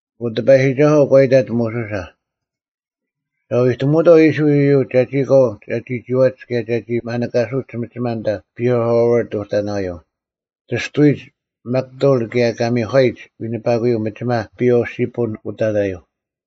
ᐊᑯ ᑎᐸᔨᒋᒐᓱᐤ ᒂ ᐃᑕᑦ ᒧᓱᓴ, “ᒐ ᐎᑎᒧᐅᑥᐤ ᐃᔅᕋᐃᓪ ᐃᔪᒡ ᒐᒋ ᑲᐤ ᒐᒋ ᒋᐛᒡ ᑭᔭ ᒐᒋ ᒪᓂᑲᓱᒡ ᒥᒋᒪ ᐊᓐᑕ ᐸᐃ-ᐦᐊᐦᐃᕈᑦ ᐅᑕᓇᔪᐤ, ᑎᔅᑐᐎᒡ ᒥᒃᑕᐅᓪ ᑭᔭ ᑲ ᒥᒂᔨᒡ ᐎᓂᐸᑯᔪᐤ ᒥᒋᒪ ᐸᐊᓪ-ᓯᐳᓐ ᐅᑕᓇᔪᐤ᙮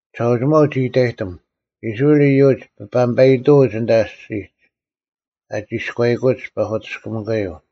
ᒋᓴᐅᒋᒪᐤ ᒋᑭ ᐃᑕᔨᑎᒻ, ‘ᐃᔅᕋᐃᓪ ᐃᔪᒡ ᐱᐸᒥᔨᑕᐅᒡ ᐊᓐᑕ ᐊᔅᒋᒡ, ᐊ ᒋᔎᐃᑯᒡ ᐸᐧᑯᑎᔅᑭᒥᑯᔪᐤ᙮’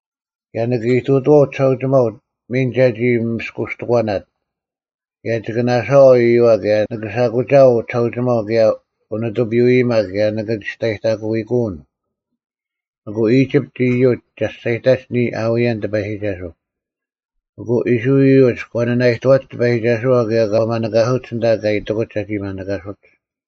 ᑭᔭ ᓂᑭ ᐃᑐᑐᐛᐤ ᒋᓴᐅᒋᒪᐤ ᒥᓐ ᒐᒋ ᒥᔅᑯᔅᑎᒂᓇᑦ, ᑭᔭ ᒋᑭ ᓇᓴᐛᐤ ᐃᔪᐛ ᑭᔭ ᓂᑭ ᓴᐧᑯᒋᐊᐤ ᒋᓴᐅᒋᒪᐤ ᑭᔭ ᐅᓂᑐᐱᔪᐅ-ᐃᔨᒪ ᑭᔭ ᓂᑭ ᒋᔅᑕᔨᑕᑯᐃᑯᐅᓐ᙮ ᐊᑯ ᐃᒋᑉᑦ ᐃᔪᒡ ᒐᔅᒐᔨᑕᒡ ᓂᔾ ᐊᐅᔭᓐ ᑎᐸᔨᒋᒐᓱᐤ᙮” ᐊᑯ ᐃᔅᕋᐃᓪ ᐃᔪᒡ ᒂ ᓂᓇᐃᑐᐛᒡ ᑎᐸᔨᒋᒐᓱᐛ ᑭᔭ ᒂ ᒪᓂᑲᓱᒡ ᐊᓐᑕ ᑲ ᐃᑎᑯᒡ ᒐᒋ ᒪᓂᑲᓱᒡ᙮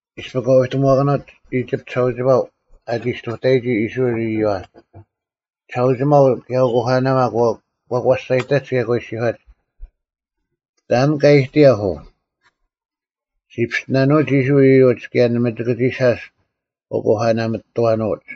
ᐃᔅᐱ ᑲ ᐎᑎᒧᐛᑭᓄᐅᑦ ᐃᒋᑉᑦ ᒋᓴᐅᒋᒪᐤ ᐊᒋ ᔅᑐᑕᔨᒋ ᐃᔅᕋᐃᓪ ᐃᔪᐛ, ᒋᓴᐅᒋᒪᐤ ᑭᔭ ᐅᑯᐸᓇᒪ ᒂ ᒂᔅᒐᔨᑕᒡ ᑭᔭ ᒂ ᐃᔅᒋᔄᒡ, “ᑕᓐ ᑲ ᐊᐃᑎᔭᐧᒃ ᐅ? ᔅᒋ ᐱᔅᑎᓇᓄᐅᒡ ᐃᔅᕋᐃᓪ ᐃᔪᒡ ᑭᔭ ᓇᒪ ᒋᑭ ᒋ ᓴᔅ ᐅᑯᐸᓇᒥᑐᐛᓄᐅᒡ!”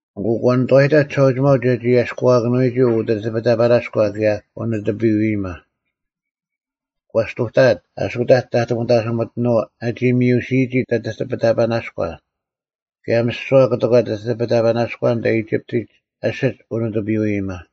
ᐊᑯ ᒂ ᓂᑐᐛᔨᑕᐧᒃ ᒋᓴᐅᒋᒪᐤ ᒐᒋ ᐊᔭᔅᑯᐛᔭᑭᓄᐎᒋ ᐅᑎᑎᐱᑕᐸᓇᔎ ᑭᔭ ᐅᓂᑐᐱᔪᐅ-ᐃᔨᒪ᙮ ᒂ ᔅᑐᑕᐊᑦ ᐊᓱᑕᒡ ᑕᑐᐤ ᒥᑕᓯᒥᑎᓄᐤ ᐛᒋ ᒥᔪᓯᔨᒋ ᑎᑎᐱᑕᐸᓇᔎ, ᑭᔭ ᒥᓯᐛ ᑯᑎᒂ ᑎᑎᐱᑕᐸᓇᔎ ᐊᓐᑕ ᐃᒋᑉᑎᒡ ᐊᓯᒡ ᐅᓂᑐᐱᔪᐅ-ᐃᔨᒪ᙮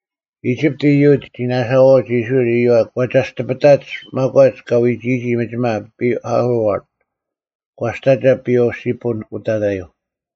ᐃᒋᑉᑦ ᐃᔪᒡ ᒋ ᓇᓴᐛᐅᒡ ᐃᔅᕋᐃᓪ ᐃᔪᐛ ᒂ ᒐᔅᑎᐱᑕᒡ ᒪᒂᒡ ᑲ ᐎᒋᔨᒋ ᒥᒋᒪ ᐸᐃ-ᐦᐊᐦᐃᕈᑦ, ᒂᔅᑕᒐ ᐸᐊᓪ-ᓯᐳᓐ ᐅᑕᓇᔪᐤ᙮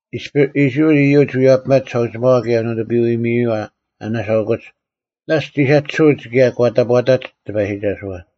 ᐃᔅᐱ ᐃᔅᕋᐃᓪ ᐃᔪᒡ ᐎᔭᐱᒪᒡ ᒋᓴᐅᒋᒪᐛ ᑭᔭ ᐅᓂᑐᐱᔪᐅ-ᐃᔨᐛ ᐊ ᓇᓴᐅᑯᒡ, ᓇᔅᒡ ᒋ ᓴᒋᓯᐅᒡ ᑭᔭ ᒂ ᑕᑈᑕᒡ ᑎᐸᔨᒋᒐᓱᐛ᙮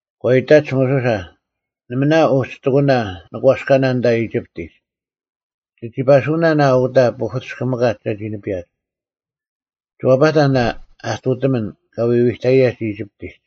ᒂ ᐃᑕᒡ ᒧᓱᓴ, “ᓇᒪ ᓇ ᐅᒋᑎᑯᓇ ᓂᒂᔅᑲᓇ ᐊᓐᑕ ᐃᒋᑉᑎᒡ? ᒋᒋ ᐸᓱᐅᓇᓐ ᐊ ᐅᑕ ᐸᐧᑯᑎᔅᑭᒥᑲᒡ ᒐᒋ ᓂᐱᔭᒡ? ᒋ ᐛᐸᑕᓐ ᐊ ᐊᑐᑎᒥᓐ ᑲ ᐎᐎᑕᔨᔭᒡ ᐃᒋᑉᑎᒡ!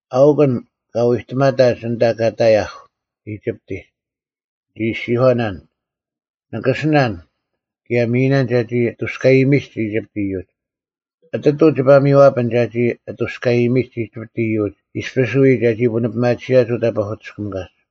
ᐊᐅᒄ ᐊᓐ ᑲ ᐎᑎᒪᑕᒡ ᐊᓐᑕ ᑲ ᑕᔭᐧᒃ ᐃᒋᑉᑎᒡ! ᓂᒋ ᐃᔅᒋᔄᓇᓐ, ‘ᓂᑭᓯᓇᓐ, ᑭᔭ ᒥᔨᓇᓐ ᒐᒋ ᐊᑐᔅᑲᔨᒥᒡ ᐃᒋᑉᑦ ᐃᔪᒡ᙮’ ᐊᑎᑐᐤ ᒋᐸ ᒥᔽᐱᓐ ᒐᒋ ᐊᑐᔅᑲᔨᒥᒡ ᐃᒋᑉᑦ ᐃᔪᒡ ᐃᔅᐱᔅ ᐎ ᒐᒋ ᐳᓂᐱᒪᑎᓯᔭᒡ ᐅᑕ ᐸᐧᑯᑎᔅᑭᒥᑲᒡ!”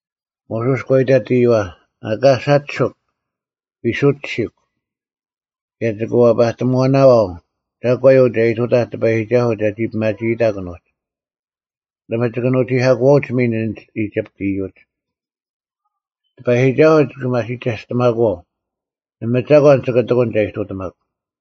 ᒧᓱᔅ ᒂ ᐃᑕᑦ ᐃᔪᐛ, “ᐊᑲ ᓴᒋᓱᒄ! ᐎ ᓱᒋᓯᒄ, ᑭᔭ ᒋᑭ ᐛᐸᑎᒺᓇᐛᐤ ᒐᒂᔪᐤ ᒐ ᐃᑐᑕᐧᒃ ᑎᐸᔨᒋᒐᓱᐤ ᒐᒋ ᐱᒪᒋᐃᑕᒄ ᐊᓄᒡ᙮ ᓇᒪ ᒋᑭ ᓄᒋᐧᑲᑯᐛᐅᒡ ᒥᓐ ᐊᓐᒡ ᐃᒋᑉᑦ ᐃᔪᒡ᙮ ᑎᐸᔨᒋᒐᓱᐤ ᒋᑭ ᒪᓯᒐᔅᑎᒪᑯᐛᐤ, ᓇᒪ ᒐᒂᓐ ᒋᑭ ᑎᑯᓐ ᒐ ᐃᑐᑎᒪᒄ᙮”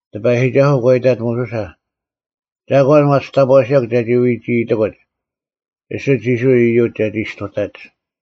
ᑎᐸᔨᒋᒐᓱᐤ ᒂ ᐃᑕᑦ ᒧᓱᓴ, “ᒐᒂᓐ ᐛᒋ ᑕᑈᓯᔭᒄ ᒐᒋ ᐎᒋᐃᑎᑯᒡ? ᐃᓯᒡ ᐃᔅᕋᐃᓪ ᐃᔪᒡ ᒐᒋ ᔅᑐᑕᒡ᙮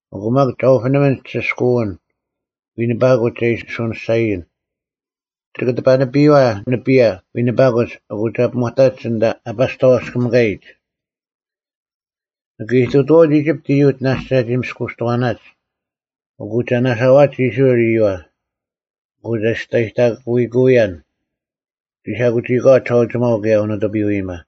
ᐊᑯ ᒪᒃ ᒐ ᐅᐱᓂᒥᓐ ᒋᓯᔅᑲᐅᓐ, ᐎᓂᐸᑯᒡ ᒐ ᐃᓯ ᓱᓂᔅᒐᔨᓐ᙮ ᒋᑭ ᑎᐸᓂᐱᔨᐛ ᓂᐱᔭ ᐎᓂᐸᑯᒡ ᐊᑯ ᒐ ᐱᒧᑕᒡ ᐊᓐᑕ ᐊ ᐸᔅᑕᐛᔅᑲᒥᑲᔨᒡ᙮ ᓂᑭ ᐃᑐᑐᐛᐅᒡ ᐃᒋᑉᑦ ᐃᔪᒡ ᓇᔅᒡ ᒐᒋ ᒥᔅᑯᔅᑎᒂᓇᒡ, ᐊᑯ ᒐ ᓇᓴᐛᒡ ᐃᔅᕋᐃᓪ ᐃᔪᐛ᙮ ᐊᑯ ᒐᔅᑕᔨᑕᑯᐃᑯᐅᔭᓐ ᒋ ᓴᐧᑯᒋᐃᒂᐛ ᒋᓴᐅᒋᒪᐤ ᑭᔭ ᐅᓂᑐᐱᔪᐅ-ᐃᔨᒪ᙮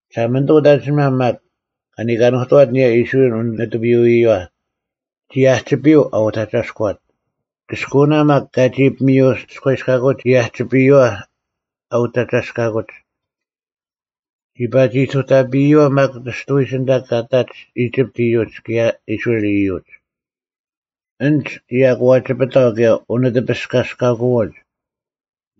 Year A) 19ᒋᓴᒪᓂᑐᐤ ᐅᑦ ᐊᓐᒋᓂᒪ ᒪᒃ, ᑲ ᓂᑲᓄᑐᐛᑦ ᐊᓂᔭ ᐃᔅᕋᐃᓪ ᓂᑐᐱᔪᐅ-ᐃᔪᐛ, ᒋ ᐊᒋᐱᔪᐤ ᐊ ᐅᑕᒐᔅᑯᐛᑦ; ᑭᔅᑯᐅᓇ ᒪᒃ ᑲᒋ ᐱᒥᐅᑎᔅᑲᐎᔅᑲᑯᒡ ᒋ ᐊᒋᐱᔪᐛ ᐊ ᐅᑕᒐᔅᑲᑯᒡ᙮ ᒋ ᐸᒋ ᐃᑐᑕᐱᔪᐛ ᒪᒃ ᑎᔅᑐᐎᒡ ᐊᓐᑕ ᑲ ᐃᑕᒡ ᐃᒋᑉᑦ ᐃᔪᒡ ᑭᔭ ᐃᔅᕋᐃᓪ ᐃᔪᒡ; ᐊᓐᒡ ᒋ ᐊᑯᐛᒋᐱᑕᐤ ᑭᔭ ᐅᓂᑎᐱᔅᑲᒋᔅᑲᑯᐛᒡ,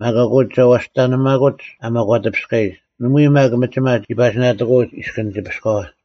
ᒪᒃ ᐊᑯ ᒋ ᐛᔅᑕᓂᒪᑯᐅᒡ ᐊ ᒪᒂᑎᐱᔅᑲᔨᒡ᙮ ᓇᒪᐎᔾ ᒪᒃ ᒥᒋᒪ ᒋ ᐸᒋ ᓇᑎᑯᐅᒡ ᐃᔅᑭᓐ ᑎᐱᔅᑲᐛ᙮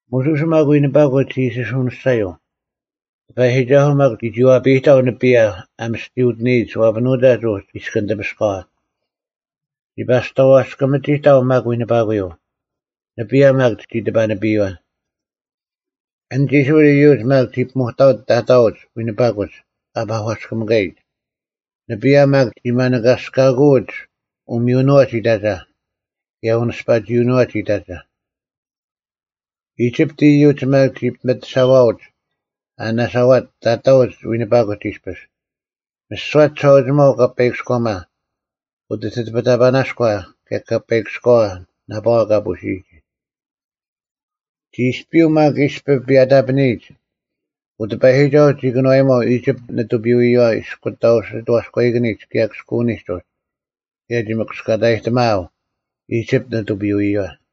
ᒧᓱᔅ ᒪᒃ ᐎᓂᐸᑯᒡ ᒋ ᐃᓯ ᓱᐅᓂᔅᒐᔪᐤ, ᑎᐸᔨᒋᒐᓱᐤ ᒪᒃ ᒋ ᒋᐛᐱᔨᑕᐤ ᓂᐱᔭ ᐊ ᒥᔅᑎᔪᑎᓂᔨᒡ ᐛᐱᓄᑕᒡ ᐅᒋ ᐃᔅᑭᓐ ᑎᐱᔅᑲᐛ, ᒋ ᐸᔅᑕᐛᔅᑲᒥᒋᑕᐤ ᒪᒃ ᐎᓂᐸᑯᔪᐤ, ᓂᐱᔭ ᒪᒃ ᒋ ᑎᐸᓂᐱᔨᐛ᙮ ᐊᓐᒡ ᐃᔅᕋᐃᓪ ᐃᔪᒡ ᒪᒃ ᒋ ᐱᒧᑕᐅᒡ ᑕᑕᐅᒡ ᐎᓂᐸᑯᒡ ᐊ ᐸᒂᔅᑭᒥᑲᔨᒡ᙮ ᓂᐱᔭ ᒪᒃ ᒋ ᒪᓂᑭᓂᔅᑲᑯᐅᒡ ᐅᒥᔪᓄᐛᒡ ᐃᑕᒐ, ᑭᔭ ᐅᓂᔅᐸᒋᐅᓄᐛᒡ ᐃᑕᒐ᙮ ᐃᒋᑉᑦ ᐃᔪᒡ ᒪᒃ ᒋ ᐱᒥᑎᓴᐛᐅᒡ, ᐊ ᓇᓴᐛᒡ, ᑕᑕᐅᒡ ᐎᓂᐸᑯᒡ ᐃᔅᐱᔅ, ᒥᓯᐛ ᒋᓴᐅᒋᒪᐤ ᐅᑲᐸᐃᑭᔎᒪ, ᐅᑎᑎᐱᑕᐸᓇᔎ, ᑭᔭ ᑲᐸᐃᑭᔎᐛ ᓇᐸᐛ ᑲ ᐳᓯᔨᒋ᙮ ᒋ ᐃᔅᐱᔪᐤ ᒪᒃ ᐃᔅᐱ ᐱᔭᑕᐸᓂᔨᒡ, ᐅᑎᐸᔨᒋᒐᐤ ᒋ ᑭᓄᐛᐱᒪᐤ ᐃᒋᑉᑦ ᓂᑐᐱᔪᐅ-ᐃᔪᐛ ᐃᔅᑯᑕᐤ ᓯᑥᔎᐃᑭᓂᒡ ᑭᔭ ᑭᔅᑯᐅᓂᒡ ᐅᒋ, ᑭᔭ ᒋ ᒥᑯᔅᑲᑕᔨᑎᒪᐊᐤ ᐃᒋᑉᑦ ᓂᑐᐱᔪᐅ-ᐃᔪᐛ᙮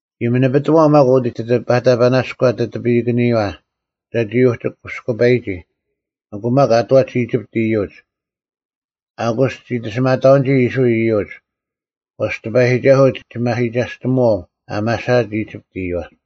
ᒋ ᒥᓂᐱᑎᒺᐤ ᒪᒃ ᐅᑎᑎᐱᑕᐸᓇᔎ ᑎᑎᐱᓂᑭᓂᔪᐛ, ᒐᒋ ᐅᒋ ᑯᓯᑯᐸᔨᒋ᙮ ᐊᑯ ᒪᒃ ᐊ ᐃᑕᒡ ᐃᒋᑉᑦ ᐃᔪᒡ, “ᐊᑯᔅ ᒋ ᑎᓯᒪᑕᐅᓐᒋ ᐃᔅᕋᐃᓪ ᐃᔪᒡ; ᐛᔅ ᑎᐸᔨᒋᒐᓱᐤ ᒋᒪᓯᒐᔅᑎᒧᐛᐤ ᐊ ᒪᓴᐊᑦ ᐃᒋᑉᑦ ᐃᔪᐛ᙮”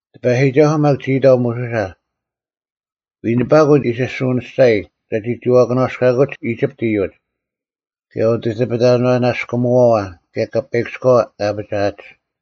ᑎᐸᔨᒋᒐᓱᐤ ᒪᒃ ᒋ ᐃᑕᐤ ᒧᓱᓴ, “ᐎᓂᐸᑯᒡ ᐃᓯ ᓱᐅᓂᔅᒐᔨ ᒐᒋ ᒋᐛᐊᒂᓇᔅᑲᑯᒡ ᐃᒋᑉᑦ ᐃᔪᒡ, ᑭᔭ ᐅᑎᑎᐱᑕᐸᓇᔅᑯᒥᐛᐛ, ᑭᔭ ᑲᐸᐃᑭᔎᐛ ᑲ ᐊᐱᒋᐊᒡ᙮”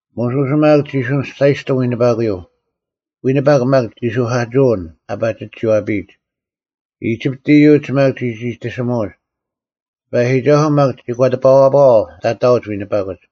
ᒧᓱᔅ ᒪᒃ ᒋ ᓱᐅᓂᔅᒐᔨᔅᑎᒻ ᐎᓂᐸᑯᔪᐤ, ᐎᓂᐸᒄ ᒪᒃ ᒋᓱᐧᑲᑎᓯᐅᓐ ᐊ ᐸᒋ ᒋᐛᐱᔨᒡ, ᐃᒋᑉᑦ ᐃᔪᒡ ᒪᒃ ᒋ ᒋᑎᓯᒧᑎᒧᒡ: ᑎᐸᔨᒋᒐᓱᐤ ᒪᒃ ᒋ ᒂᑎᐱᐛᐸᐛᐤ ᑕᑕᐅᒡ ᐎᓂᐸᑯᒡ᙮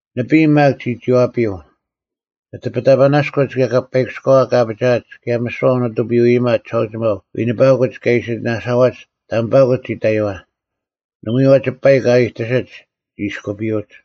ᓂᐱᔾ ᒪᒃ ᒋ ᒋᐛᐱᔪᐤ, ᑎᑎᐱᑕᐸᓇᔎᒡ ᑭᔭ ᑲᐸᐃᑭᔎᐛ ᑲ ᐊᐱᒋᐊᒡ ᑭᔭ ᒥᓯᐛ ᐅᓂᑐᐱᔪᐅ-ᐃᔨᒪ ᒋᓴᐅᒋᒪᐤ ᐎᓂᐸᑯᒡ ᑲᒋ ᐃᓯ ᓇᓴᐛᒡ ᑕᒥᐸᑯᒡ ᒋ ᑕᔪᐛ: ᓇᒪᐎᔾ ᐛᐛᒡ ᐸᐃᒄ ᐊ ᐃᑕᓯᒡ ᒋ ᐃᔅᑯᐱᔪᐅᒡ᙮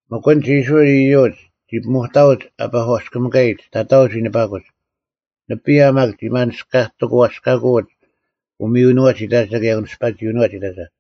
ᒥᒄ ᐊᓐᒡ ᐃᔅᕋᐃᓪ ᐃᔪᒡ ᒋ ᐱᒧᑕᐅᒡ ᐊ ᐸᒂᔅᑭᒥᑲᔨᒡ ᑕᑕᐅᒡ ᐎᓂᐸᑯᒡ: ᓂᐱᔭ ᒪᒃ ᒋ ᒪᓂᔅᑲᑎᑯᐛᔅᑲᑯᐅᒡ ᐅᒥᔪᓄᐛᒡ ᐃᑕᒐ, ᑭᔭ ᐅᓂᔅᐸᒋᐅᓄᐛᒡ ᐃᑕᒐ᙮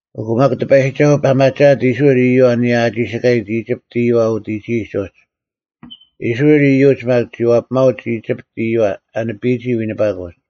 ᐊᑯ ᒪᒃ ᑎᐸᔨᒋᒐᓱᐤ ᐸᒪᒋᐊᑦ ᐃᔅᕋᐃᓪ ᐃᔪᐛ ᐊᓂᔭ ᐊ ᒋᓯᑲᔨᒡ ᐃᒋᑉᑦ ᐃᔪᐛ ᐅᑎᒋᔨᒡ ᐅᒋ: ᐃᔅᕋᐃᓪ ᐃᔪᒡ ᒪᒃ ᒋ ᐛᐱᒪᐅᒡ ᐃᒋᑉᑦ ᐃᔪᐛ ᐊ ᓂᐱᔨᒋ ᐎᓂᐸᑯᒡ᙮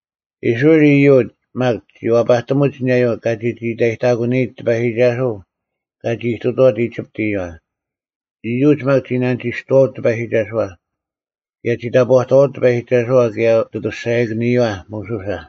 ᐃᔅᕋᐃᓪ ᐃᔪᒡ ᒪᒃ ᒋ ᐛᐸᑎᒧᒡ ᐊᓂᔭᔪᐤ ᑲ ᒋᒋ ᐃᑕᔨᑕᒂᓂᔨᒡ ᑎᐸᔨᒋᒐᓱᐤ ᑲᒋ ᐃᑐᑐᐛᑦ ᐃᒋᑉᑦ ᐃᔪᐛ: ᐃᔪᒡ ᒪᒃ ᒋ ᓇᓂᒋᔅᑐᐛᐅᒡ ᑎᐸᔨᒋᒐᓱᐛ, ᑭᔭ ᒋ ᑕᑈᑐᐛᐅᒡ ᑎᐸᔨᒋᒐᓱᐛ, ᑭᔭ ᐅᑦ ᐊᑐᔅᒐᔭᑭᓂᔪᐛ ᒧᓱᓴ᙮